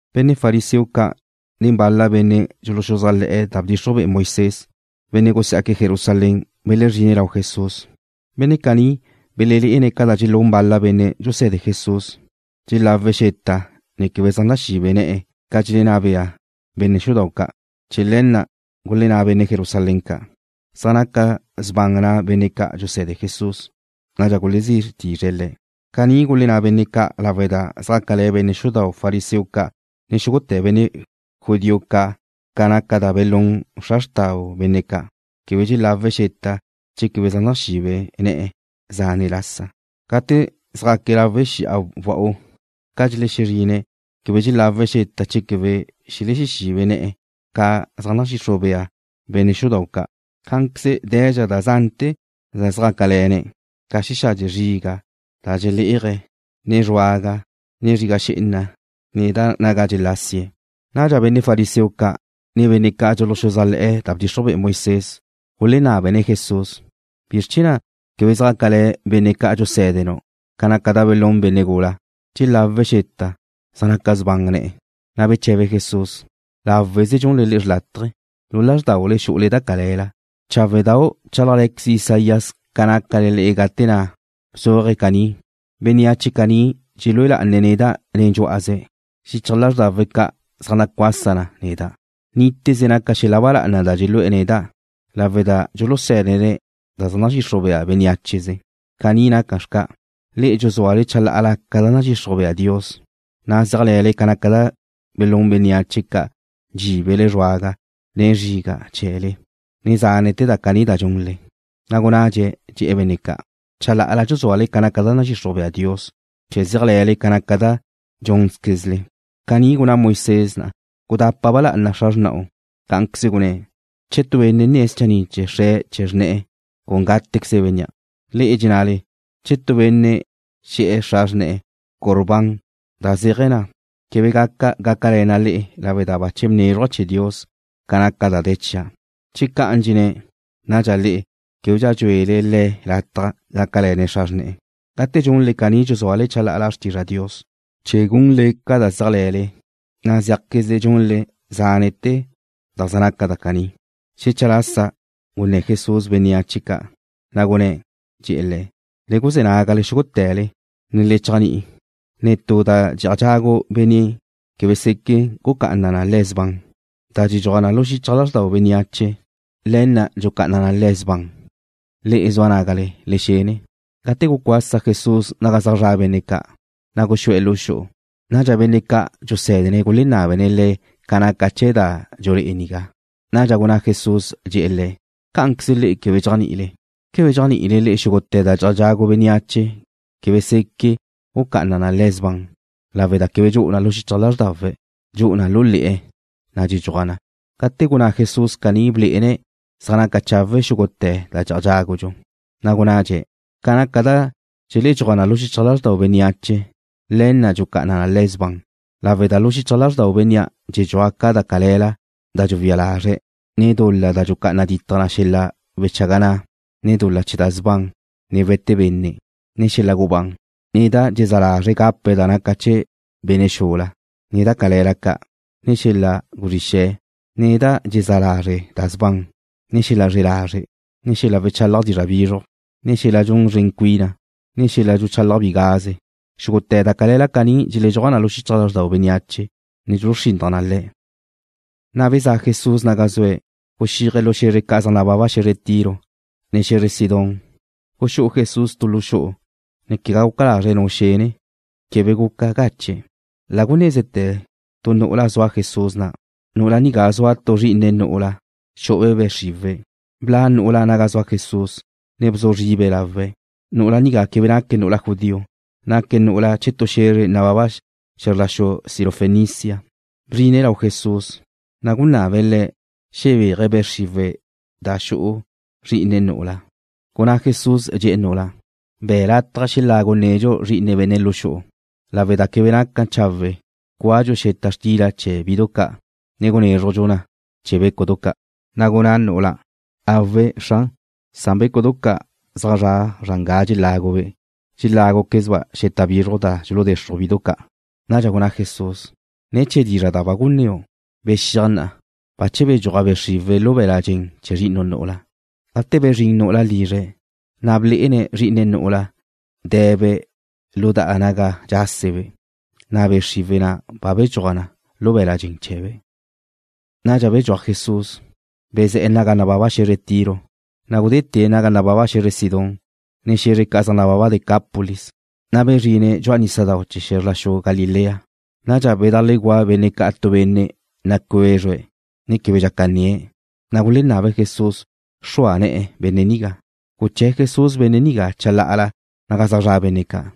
Benne' fariseo ca' nen bal-la benne' dxuluxuzájle̱'e̱ da bdxixruj be'e Moisés, benne' gusá'aque̱' Jerusalén, belezríne̱' lau Jesús. Benne' caní belelé'ene̱' ca dxelún bal-la benne' dxuse̱de Jesús, dxelawe̱' xeta ne quebe zaj naxibe ne̱'e̱ ca dxelenná bea benne' xudau' ca'. Chee̱ le̱ na' gulenná benne' Jerusalén ca': ―Zaj naca sban na' benne' ca' dxuse̱de Jesús. Nadxa gulezí tizre̱' le̱'. Caní gulenná benne' ca' lawe' da zjácale̱ benne' xudau' fariseo ca', ne xúgute̱ benne' judío ca' ca naca da belún xra xtau benne' ca', quebe dxelawe̱' xeta che quebe zaj naxibe ne̱'e̱ zane' lasa. Gate zjaque̱' lawe' xi'a wa'u, ca dxelexezrine̱' quebe dxelawe̱' xeta che quebe xelibe ne̱'e̱ ca zaj nadxixruj bea benne' xudau' ca'. Cá'anqueze de̱dxa da zante̱ da zjácale̱ne̱', ca xexadxe zriga' da dxelé'aje̱', ne zruaga, ne zriga xé'ena, ne da naga dxelásie̱'. Nadxa benne' fariseo ca', ne benne' ca' dxuluxuzájle̱'e̱ da bdxixruj be'e Moisés gulenábene̱' Jesús: ―¿Bizr chee̱ na' quebe zjácale̱ benne' ca' dxusé̱denu' ca naca da gulún benne' gula? Dxelawe̱' xeta, zaj naca sban ne̱'e̱. Na' beche̱be Jesús: ―Láweze dxunle da xrlátaje. Lu lázrdaule xu'ule da cale̱la. Cháwedau' bchálajqueze Isaías ca nácale le'e gate na' bzuaje̱' caní: Bénneache caní dxelúe lá'ane̱' neda' nen dxú'aze̱'. Xichaj lázrdawe̱' ca' zaj nacuasa na neda'. Níteze naca xel-la ba lá'ana da dxelu'e̱ neda', lawe' da dxulusé̱dene̱' da zaj nadxixruj bea bénneacheze. Caní naca xca', le'e dxuzúale chalá'ala ca da nadxixruj bea Dios, na' zéajle̱le ca naca da gulún bénneache ca dxíbele zruaga, ne zriga' chee̱le, ne zánete̱ da caní da dxunle. Na' gunnadxe̱', dxe̱'e̱ benne' ca': ―Chala'ala dxuzúale ca da nadxixruj bea Dios chee̱ zéajle̱le ca naca da tu dxúnzquezle. Caní gunná Moisés na': “Gudapa ba lá'ana xra xrna'u.” Cá'anqueze gunné̱': “Che tu benne' nne̱' schanni' chee̱ xre', che xrne'e̱, con gátequeze bénnea'.” Le'e dxennale, “Che tu benne' xe̱'e̱ xra xrne̱'e̱: Corbán,” da zéaje̱ na, quebe gaca gácale̱na' le'e lawe' da bache bnézruja' chee̱ Dios ca naca da de̱ chia'. Che ca'an dxenné̱', nadxa le'e québedxa dxu'ule le̱' lataj gácale̱ne̱' xra xrne̱'e̱. Gate dxunle caní dxuzúale chalá'ala xrtizra Dios, chee̱ gunle ca da zéajle̱le. Na' zéajquezle dxunle zánete̱ da zaj naca na caní. Xecha lasa gunné̱ Jesús bénneache ca', na' gunné̱', dxe̱'e̱ le̱': ―Le guzé̱ nágale xúgute̱le, ne le chéajni'i. Netú da dxe'aj dxagu benne' quebe seque gucá'ana na le̱' sban. Da dxedxuaj na lu xichaj lázrdau bénneache, le̱ na' dxucá'ana na le̱' sban. Le'e zua nágale, le xene. Gate gucuasa Jesús naga zaj zra' benne' ca', na' guxú'e̱ lu xu'u. Nadxa benne' ca' dxusé̱dene̱' gulenábene̱' Le̱' ca naca chee̱ da dxulé'e nigá. Nadxa gunná Jesús, dxe̱'e̱ le̱': ―¿Cá'anqueze le'e quebe dxéajni'ile? ¿Quebe dxéajni'ile xúgute̱ da dxe'aj dxagu bénneache quebe seque gucá'ana na le̱' sban lawe' da quebe dxu'u na lu xichaj lázrdawe̱'. Dxu'u na lu le̱'e̱, na' dxedxuaj na? Cate' gunná Jesús caní blé'ene̱' zaj naca chawe' xúgute̱ da dxe'aj dxágudxu. Na' gunnadxe̱': ―Ca naca da dxedxuaj na lu xichaj lázrdau bénneache, le̱ na' dxucá'ana na le̱' sban lawe' da lu xichaj lázrdau bénnea' dxeledxúaj ca da cale̱la da dxuwía lazre̱', ne dul-la da dxucá'ana ditaj xel-la wechaga na', ne dul-la chee̱ da sban, ne we̱te benne', ne xel-la gubán, ne da dxezá lazre' gapa da naca chee̱ benne' xula, ne da cale̱la ca', ne xel-la wezrí xe̱', ne da dxezá lazre' da sban, ne xel-la zre̱'e lazre', ne xel-la wechalaj dizra' bizruj, ne xel-la dxun szren cuina, ne xel-la dxuchalaj bigaze. Xúgute̱ da cale̱la caní dxeledxúaj na lu xichaj lázrdau bénneache, ne dxuluxrinnaj na le̱'. Na' bezá'a Jesús naga zue̱', guxíaje̱' lu xe̱zre ca' zaj nababa xe̱zre Tiro, ne xe̱zre Sidón. Guxú'u Jesús tu lu xu'u, ne quegá guca lazre̱' nu xene. Quebe guca gache̱'. La gunézete̱ tu nu'ula zua Jesús na'. Nu'ula nigá zua tu zrí'ine̱' nu'ula, xu'ube' be' xriwe̱'. Bla' nu'ula' naga zua Jesús, ne bzu zribe̱' lawe̱'. Nu'ula nigá quebe naque̱' nu'ula judío. Naque̱' nu'ula chee̱ tu xe̱zre nababa xe̱zr la xu Sirofenicia. Bzrine̱' lau Jesús, na' gunabe̱' Le̱' xebéaje̱' be' xriwe̱' da xu'u zrí'ine̱' nu'ula. Gunná Jesús, dxe̱'e̱ nu'ula': ―Be̱' lataj xelagu nedxu zri'ine benne' lu xu'u, lawe' da quebe naca chawe' cúadxu xeta xtila chee̱ bidu ca', ne gunézrujdxu na chee̱ bécudu ca'. Na' gunná nu'ula': ―Awe', Xran, san bécudu ca' zaj zra' zran ga dxelágube' dxeláguquezba' xeta bizruj da dxuluzexruj bidu ca'. Nadxa gunná Jesús: ―Ne̱ chee̱ dizra' da ba gunnéu', bexíaj na'a. Bache bedxúaj be' xriwe̱' lu be̱l-la' dxen chee̱ zri'inu' nu'ula. Gate bezrín nu'ula' lizre̱', na' blé'ene̱' zrí'ine̱' nu'ula de̱be' lu da naga dxásebe', na' be' xriwe̱' ba bedxúaj na lu be̱l-la' dxen chee̱be'. Nadxa bedxúaj Jesús, bezé̱'e̱ naga nababa xe̱zre Tiro, na' gudétie̱' naga nababa xe̱zre Sidón, ne xe̱zre ca' zaj nababa Decápolis, na' bezrine̱' dxu'a nísadau' chee̱ xe̱zr la xu Galilea. Nadxa bedajleguá' benne' ca' tu benne' nacuézrue̱', ne quebe dxaca nnie̱', na' gulenábe̱' Jesús xrua ne̱'e̱ benne' nigá. Guché̱ Jesús benne' nigá chalá'ala naga zaj zra' benne' ca',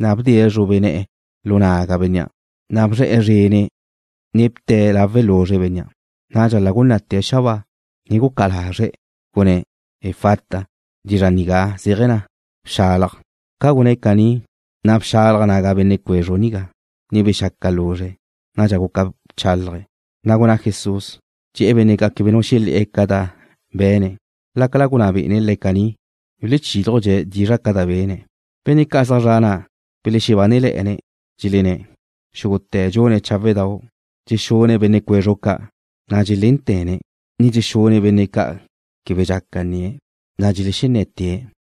na' bdie̱' zrube ne̱'e̱ lu naga bénnea', na' bzre̱'e̱ zrene̱', ne bte̱' lawe' luzre bénnea'. Nadxa la gunná'te̱' xabáa, ne gucá'a lazre̱', gunné̱': ―Efata. Dizxa' nigá zéaje̱ na: Bxalaj. Ca gunné̱' caní, na' bxalaj naga benne' cuezru nigá, ne bexaca luzre̱'. Nadxa guca bchálaje̱'. Na' gunná Jesús, dxe̱'e̱ benne' ca' quebe nu xelé̱'e̱ ca da be̱ne̱'. Lácala gunná be'ene̱' le̱' caní, buluchílujdxe̱' dizra' ca da be̱ne̱'. Benne' ca' zaj zra' na' belexebánele̱'e̱ne̱', dxelenné̱': ―Xúgute̱ dxune̱' cháwedau'. Dxexune̱' benne' cuezru ca', na' dxelénte̱ne̱', ne dxexune̱' benne' ca' quebe dxaca nnie̱', na' dxelenné̱tie̱'.